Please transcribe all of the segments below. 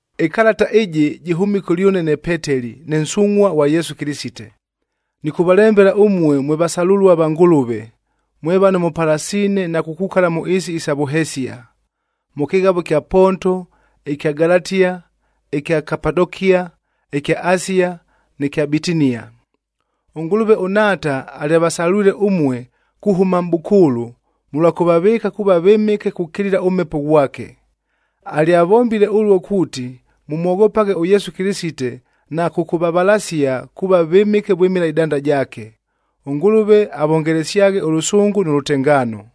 Ɨkalata ɨjɨ jɨhʉmile kʉlyʉne ne Peteli, ne nsungʼhua ghwa Yesu Kɨlɨsite. Nɨkʉvalembela ʉmue mwe vasalʉlua va Ngʉlʉve, mwe vano mʉpalasiine na kukukala mʉ ɨɨsi isa vʉhesia: mʉ kɨghavoa ɨkya Ponto, ɨkya Galatia, ɨkya Kapadokia, ɨkya Asia nɨ kya Bitinia. ɄNgʉlʉve ʉNhaata alyavasalwile ʉmue kuhʉma mʼbʉkʉʉlʉ mʉlwa kʉvavɨɨka kuuva vɨmɨke kukilila ʉMhepo ghwake. Alyavombile ʉluo kuuti, mʉmwoghopaghe ʉYesu Kɨlɨsite na kʉkʉvavalasia kuuva vɨmɨke vwɨmɨla ɨdanda jaake. ɄNgʉlʉve avongelesyaghe ʉlʉsʉngʉ nʉ lʉtengaano.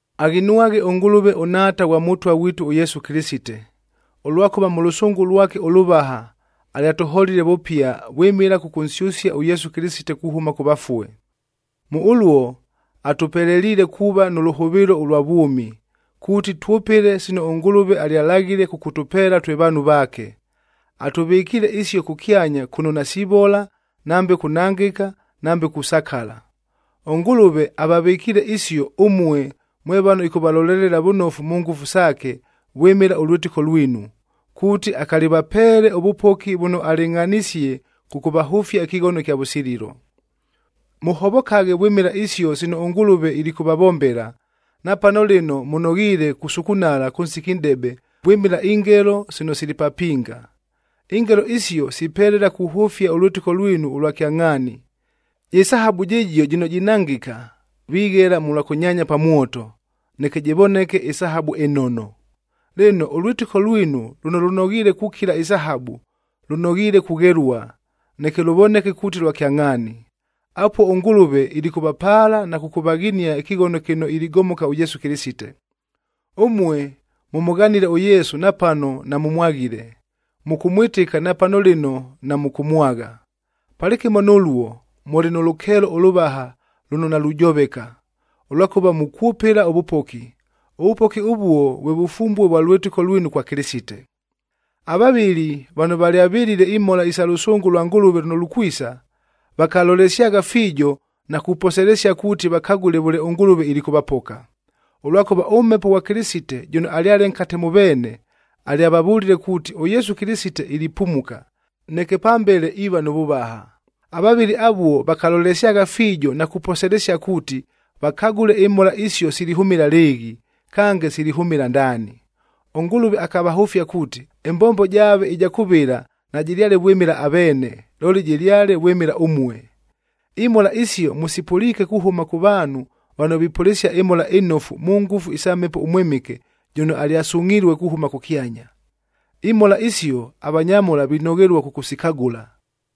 Aghinwaghe ʉNgʉlʉve ʉNhaata ghwa Mʉtwa ghwitu ʉYesu Kɨlɨsite, ʉlwakʉva mʉ lʉsʉngʉ lwake ʉlʉvaha alyatʉholile vʉpia vwɨmɨla kʉkʉnsyʉsia ʉYesu Kɨlɨsite kuhʉma kʉ vafue. Mʉ ʉluo atʉpeleliile kuuva nʉ lʉhʉvɨɨlo ʉlwa vwʉmi, kuuti twʉpɨle sino ʉNgʉlʉve alyalaghile kʉkʉtʉpeela twe vaanhu vaake. Atʉvɨkiile isio kʉkyanya kʉno nasivola, nambe kunangɨka, nambe kusakala. ɄNgʉlʉve avavɨkiile isio, ʉmue mwe vano ɨkʉvalolelela vʉnofu mʉ ngʉfu saake vwɨmɨla ʉlwɨtɨko lwinu, kuuti akalivapeele ʉvʉpoki vʉno alɨngʼhanisie kʉkʉvahʉfia ɨkɨghono ɨkya vʉsililo. Mʉhovokaghe vwɨmɨla isio sino ʉNgʉlʉve ilikʉvavombela, napano lɨno mʉnoghiile kusukunala kʉ nsiki nʼdebe vwɨmɨla ingelo sino sili papinga. Ingelo isio sipelela kuhʉfia ʉlwɨtɨko lwinu ʉlwa kyangʼhaani. Jɨ sahabu jɨjio jɨno jinangɨka, vighela mʉlwa kʉnyaanya pa mwoto, neke jɨvoneke ɨsahabu ɨnono. Lɨno, ʉlwɨtɨko lwinu lʉno lʉnoghiile kukila ɨsahabu, lʉnoghiile kughelua, neke lʉvoneke kuuti lwa kyangʼhaani. Apuo ʉNgʉlʉve ilikʉvapaala na kʉkʉvaghinia ɨkɨghono kɨno iligomoka ʉYesu Kɨlɨsite. Ʉmue mʉmʉghanile ʉYesu napano namʉmwaghile, mʉkʉmwɨtɨka napano lɨno namʉkʉmwagha. Palɨkɨmo nʉluo, mʉlɨ nʉ lʉkeelo ʉlʉvaha lʉno nalujoveka, ʉlwakʉva mukwʉpɨla ʉvʉpoki. Ʉvʉpoki ʉvuo vwe vʉfumbue vwa lwɨtɨko lwinu kwa Kɨlɨsite. Avavɨli vano valyavɨlile imhola isa lʉsʉngʉ lwa Ngʉlʉve lʉno lukwisa, vakalolesyagha fiijo na kuposelesia kuuti vakagʉle vʉle ʉNgʉlʉve ilikʉvapoka. Ʉlwakʉva ʉMhepo ghwa Kɨlɨsite jʉno alyale nkate mʉ veene, alyavavʉlile kuuti ʉYesu Kɨlɨsite ilipumuka, neke pambele iiva nʉ vʉvaha. Avavɨli avuo vakalolesyagha fiijo na kuposelesia kuuti vakagʉle imhola isio silihʉmɨla lɨɨghi, kange silihʉmɨla ndaani. ɄNgʉlʉve akavahʉfia kuuti, ɨmbombo jaave ɨja kʉvɨla najɨlyale vwɨmɨla aveene, looli jɨlyale vwɨmɨla ʉmue. Imhola isio mʉsipʉliike kuhʉma kʉ vaanhu vano vipʉlɨsia ɨMhola ɨNofu mʉ ngʉfu isa Mhepo ʉMwɨmɨke jʉno alyasungʼhilue kuhʉma kʉkyanya. Imhola isio, avanyamhola vinoghelua kʉkʉsikagʉla.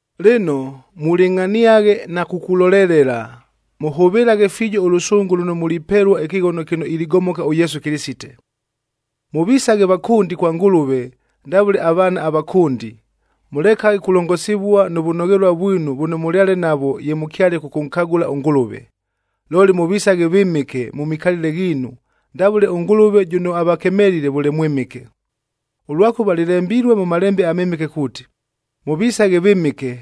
Lɨno, mulɨngʼhaniaghe na kukulolelela, mʉhʉvɨlaghe fiijo ʉlʉsʉngʉ lʉno mulipelua ɨkɨghono kɨno iligomoka ʉYesu Kɨlɨsite. Mʉvisaghe vakʉndi kwa Ngʉlʉve ndavʉle avaana avakʉndi, mʉlekaghe kulongosivua nʉ vʉnoghelua vwinu vʉno mʉlyale navwo ye mʉkyale kʉkʉnkagʉla ʉNgʉlʉve. Looli, mʉvisaghe vɨmɨke mʉ mikalɨle ghiinu ndavʉle ʉNgʉlʉve jʉno avakemelile vʉle mwɨmɨke. Ʉlwakʉva lɨlembilue mʉ Malembe aMɨmɨke kuuti, “Mʉvisaghe vɨmɨke,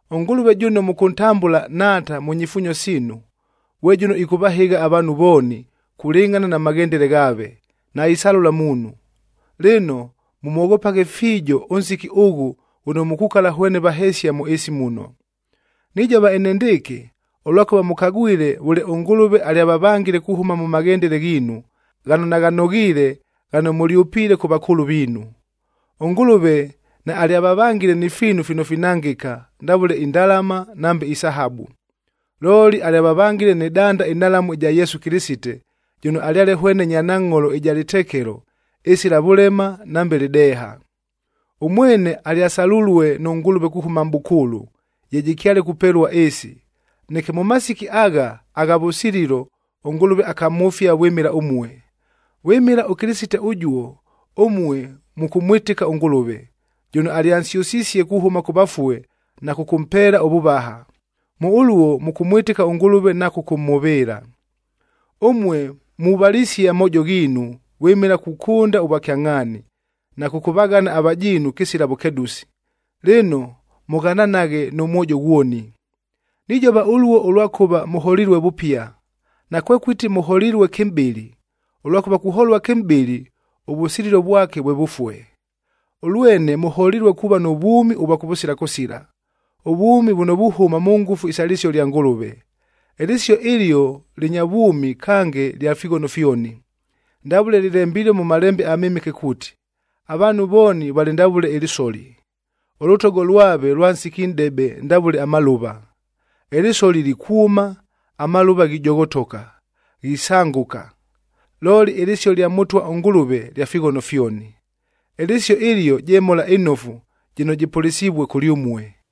ɄNgʉlʉve jʉno mʉkʉntambʉla Nhaata mʉ nyifuunyo siinu, ghwe jʉno ɨkʉvahɨgha avaanhu vooni kulɨngʼhana na maghendele ghaave, naisalʉla muunhu. Lɨno, mʉmwoghopaghe fiijo ʉnsiki ʉghʉ ghʉno mukukala hwene vahesia mʉ ɨɨsi muno. Nijova enendɨɨkɨ, ʉlwakʉva mʉkagwile vʉle ʉNgʉlʉve alyavavangile kuhʉma mʉ maghendele ghiinu, ghano naghanoghiile ghano mʉlyʉpiile kʉ vakʉʉlʉ viinu. ɄNgʉlʉve naalyavavangile ni fiinu fino finangɨka ndavʉle indalama nambe isahabu, looli alyavavangile nɨ danda ɨnhalamu ɨja Yesu Kɨlɨsite, jʉno alyale hwene nyanangʼholoc ɨja lɨtekelo, ɨsila vʉlema nambe lɨdeeha. Ʉmwene alyasalulue nʉ Ngʉlʉve kuhʉma mʼbʉkʉʉlʉ, ye jɨkyale kupelua ɨɨsi, neke mʉ masiki agha, agha vʉsililo ʉNgʉlʉve akamhʉfia vwɨmɨla ʉmue. Vwɨmɨla ʉKɨlɨsite ʉjuo, ʉmue mʉkʉmwɨtɨka ʉNgʉlʉve, jʉno alyansyʉsisie kuhʉma kʉ vafue na kʉkʉmpeela ʉvʉvaha. Mʉ ʉluo mʉkʉmwɨtɨka ʉNgʉlʉve na kʉkʉmhʉvɨɨla. Ʉmue muvalisie amoojo ghiinu vwɨmɨla kukʉnda ʉvwakyangʼhaani, na kʉkʉvaghana avajiinu kɨsila vʉkedʉsi, lɨno mʉghananaghe nʉ mwojo ghwoni. Nijova ʉluo ʉlwakʉva mʉholilue vʉpia. Nakwekʉti mʉholilue kɨmʼbɨlɨ, ʉlwakʉva kuholua kɨmʼbɨlɨ ʉvʉsililo vwake vwe vʉfue. Ʉlwene mʉholilue kuuva nʉ vwʉmi ʉvwa kʉvʉsila kʉsila, ʉvwʉmi vʉno vuhʉma mʉ ngʉfu isa lɨsio lya Ngʉlʉve. Ɨlɨsio ɨlio lɨnya vwʉmi kange lya fighono fyoni. Ndavʉle lɨlembilue mʉ Malembe aMɨmɨke kuuti, “Avaanhu vooni valɨ ndavʉle ɨlɨsoli. Ʉlʉtogo lwave lwa nsiki nʼdebe ndavʉle amalʉva. Ɨlɨsoli likwʉma, amalʉva ghijoghotoka, ghisangʉka. Looli ɨlɨsio lya Mʉtwa ʉNgʉlʉve lya fighono fyoni.”d Ɨlɨsio ɨlio je Mhola ɨNofu jɨno jɨpʉlɨsivue kʉlyʉmue.